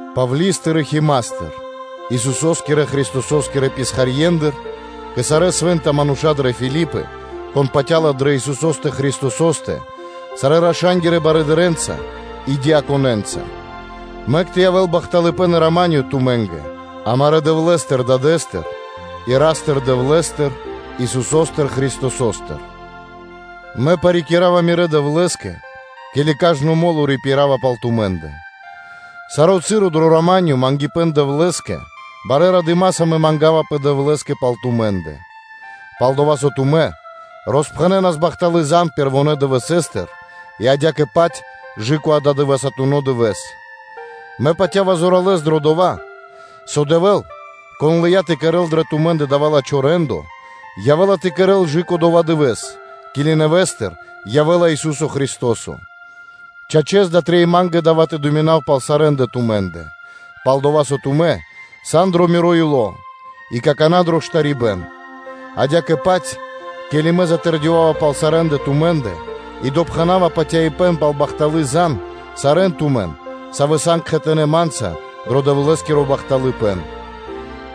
Павли́стыр и Химастыр (Тимафеёстыр), Исусо́скирэ Христосо́скирэ писхарьендыр, кэ сарэ́ свэ́нта мануша́ дрэ Филипы, кон патя́ла дрэ Исусо́стэ Христосо́стэ сарэ́ епископэнца (кхангирья́кирэ барыдырэ́нца) и диаконэнца; мэк тэ явэ́л бахталыпэ́н и рама́нё (миро) тумэ́нгэ амарэ́ Дэвлэ́стыр Дадэ́стыр и Ра́стыр-Дэвлэ́стыр, Исусо́стыр Христосостыр. Мэ парикирава мирэ́ Дэвлэ́скэ, ке́ли кажно мо́ло рипирава пал тумэ́ндэ, саро́ часо дро миро мангипэ́н Дэвлэ́скэ, барэ́ радыма́са мэ мангавапэ Дэвлэ́скэ пал тумэ́ндэ, пал-дова́ со тумэ́ роспхэнэнас бахталы́ зан (звесь) пэрвонэ́ дывэсэ́стыр и адя́кэ-паць кэ ададывэсатуно дывэ́с, мэ патя́ва зоралэ́с дро дова́, со Дэвэ́л, Кон лыя́ тэ кэрэ́л дрэ тумэ́ндэ дава́ лачхо́ рэ́ндо, явэ́ла тэ кэрэ́л кэ/жы́ко дова́ Дывэ́с, ке́ли нэвэ́стыр явэ́ла Ису́со Христо́со: чачэс, дава́ трэй ма́нгэ тэ мыслинав пал сарэ́ндэ тумэ́ндэ, пал-дова́ со тумэ́ сан дро миро ило́ и какана́ дро штарибэ́н (бэшыбэн), адя́кэ-паць, ке́ли мэ затэрдёвава пал сарэ́ндэ тумэ́ндэ и допхэнава патяибэ́н пал бахталы́ зан (звесь), сарэ́н тумэ́ндэ, савэ́ сан кхэтанэ́ ма́нца дро Дэвлэ́скиро бахталыпэ́н.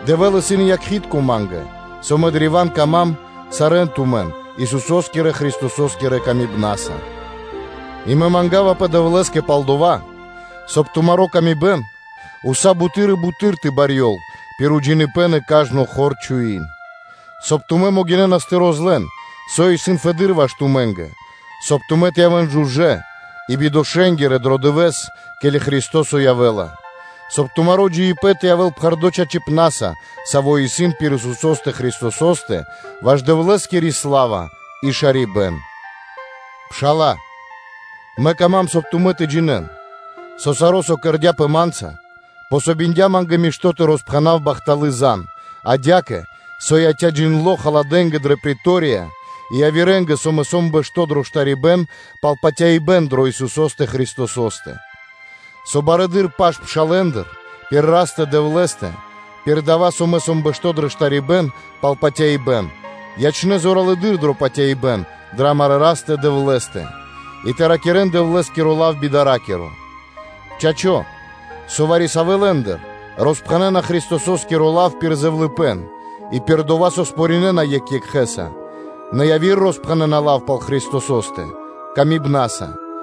Дэвэ́л исын якхи́тко ма́нгэ, со тумэ́ сан древа́н дро́га ма́нгэ сарэ́ тумэ́, Исусо́скирэ Христосо́скирэ ласкаса. И мэ мангавапэ Дэвлэ́скэ пал дова́, соб (кай) тумари́ паты́в кэ яви́р мануша́ уса́ буты́р и буты́р тэ барьёл пир джиныбэ́н и кажно хор ґалыибэ́н, соб (кай) тумэ́ могинэ́нас тэ розлэн (тэ розгалён), со исын фэды́р ваш тумэ́нгэ, соб (кай) тумэ́ тэ явэ́н жужэ́ и бибангипнаскирэ дро Дывэ́с, ке́ли Христо́со явэ́ла, соб (кай) тумаро́ джиибэ́н тэ явэ́л пхэрдо́ чачипна́са, саво́ исын пир Исусо́стэ Христосо́стэ, ваш Дэвлэ́скири сла́ва и шарибэ́н. Пшала́лэ, мэ кама́м, соб (кай) тумэ́ тэ джинэ́н, со саро́, со кэрдя́пэ ма́нца, и со помогиндя ма́нгэ мишто́ тэ роспхэнав бахталы́ зан, адя́кэ, со яця́ джиндло́ халадэнгэ дрэ претория и явирэ́нгэ, со мэ сом бэшто́ дро штарибэ́н пал патяибэ́н дро Исусо́стэ Христосо́стэ, со барэды́р паш пшалэ́ндыр пир Растэ-Дэвлэ́стэ, пир дава́, со мэ сом бэшто́ дро штарибэ́н пал патяибэ́н, ячнэ́ зоралэды́р дро патяибэ́н дрэ амарэ́ Растэ-Дэвлэ́стэ и тэ ракирэ́н Дэвлэ́скиро лав би дара́киро. Чачо́, со вари-савэ́ лэ́ндыр роспхэнэна Христосо́скиро лав пир зэвлыныпэ́н и пир дова́, со выпробинэна екх екхэ́с, нэ яви́р роспхэнэна лав пал Христосо́стэ патыва́са.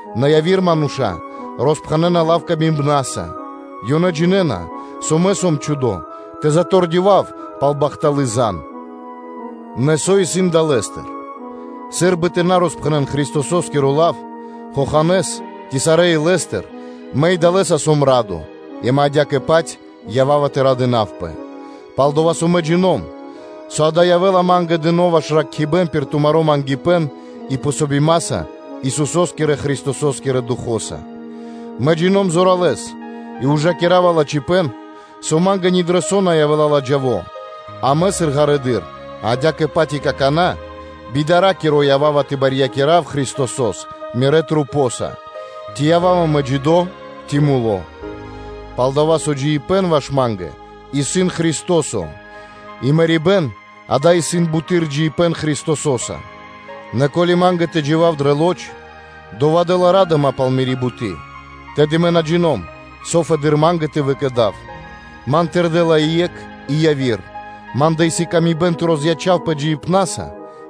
Нэ яви́р мануша́ роспхэнэна лав пир ла́ска; ёнэ джинэ́на, со мэ сом чхудо тэ затэрдёвав пал бахталы́ зан. Нэ со исын далэ́стыр? Сы́рбы тэ на роспхэнэ́н Христосо́скиро лав дуемуиткэс (притворнэс) ци сарэ́ илэ́стыр, мэ и далэскэ сом радо и мэ адя́кэ-паць ява́ва тэ радынавпэ; пал-дова́ со мэ джино́м, со дава́ явэ́ла ма́нгэ дыно́ ваш зракхибэ́н пир тумаро́ мангипэ́н и подрикирибэ́н Исусо́скирэ-Христосо́скирэ Духо́стыр. Мэ джино́м зоралэ́с и мэ патя́ва, со ма́нгэ ни дро со на явэ́ла ладжаво, а мэ, сыр ґарэдыр, адя́кэ-паць и какана́ би дара́киро, ява́ва тэ барьякирав паты́в Христосо́скэ мирэ́ джиибнаса, ци ява́ва мэ джидо́, ци муло́. Палдава́ со джиибэ́н ваш ма́нгэ исын Христо́со, и мэрибэ́н дава́ исын буты́р джиибэ́н Христосо́са; нэ ко́ли ма́нгэ тэ джива́в дрэ лоч (плоть), дова́ дэ́ла ра́дыма пал мири́ буты́, тэды мэ на джино́м, со фэды́р ма́нгэ тэ выкэдав. Ман тырдэла и екх и яви́р: ма́ндэ исын выкэдыибэн тэ розячавпэ джиибнаса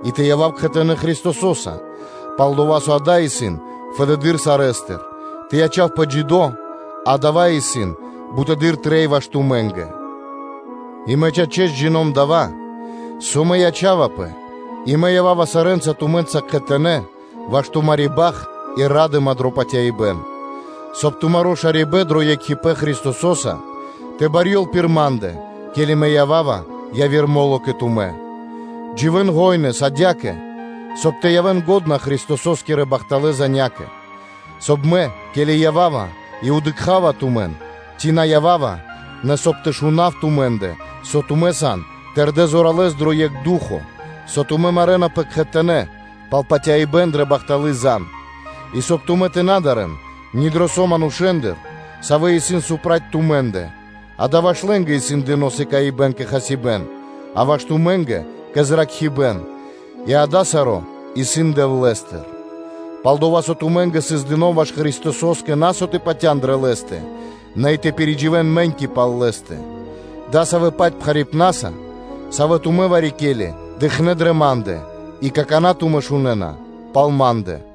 и тэ явав кхэтанэ́ Христосо́са, пал-дова́ со дава́ исын фэды́р сарэ́стыр, нэ тэ ячавпэ джидо́, дава́ исын буты́р трэй ваш тумэ́нгэ; и мэ чачэс, джино́м дава́, со мэ ячавапэ и мэ ява́ва сарэ́нца тумэ́нца кхэтанэ́ ваш тумари́ бахт и ра́дыма дро патяибэ́н; соб (кай) тумаро́ шарибэ́н дро екхипэ́н Христосо́са тэ барьёл пир ма́ндэ, ке́ли мэ ява́ва яви́р мо́ло кэ тумэ́. Дживэ́н гожэс адя́кэ, соб (кай) тэ явэ́н лачхэ́ Христосо́скирэ – бахталэ́ занякэ (звесякэ), соб (кай) мэ, ке́ли ява́ва и дыкха́ва тумэн, ци на ява́ва, нэ соб (кай) тэ шунав тумэ́ндэ, со тумэ́ сан тэрдэ́ зоралэ́с дро екх ду́хо (фа́но), со тумэ́ марэнапэ кхэтанэ́ пал патяибэ́н дрэ бахталы́ зан (звесь), и соб (кай) тумэ́ тэ на дарэ́н ни дро со манушэ́ндыр, савэ́ исын сцял (проти) тумэ́ндэ, дава́ ваш лэ́нгэ исын дыно́ сыкаибэ́н кэ хасибэ́н, а ваш тумэ́нгэ кэ зракхибэ́н, и дава́ саро́ исын Дэвлэ́стыр; пал-дова́ со тумэ́нгэ сыс дыно́ ваш Христосо́скэ на со тэ патя́н дрэ Лэ́стэ, нэ и тэ пиридживэн мэ́ньки пал Лэ́стэ, дасавэ́-паць пхарипнаса, саво́ тумэ́ вари-ке́ли дыкхнэ́ дрэ ма́ндэ, и какана́ тумэ́ шунэ́на пал ма́ндэ.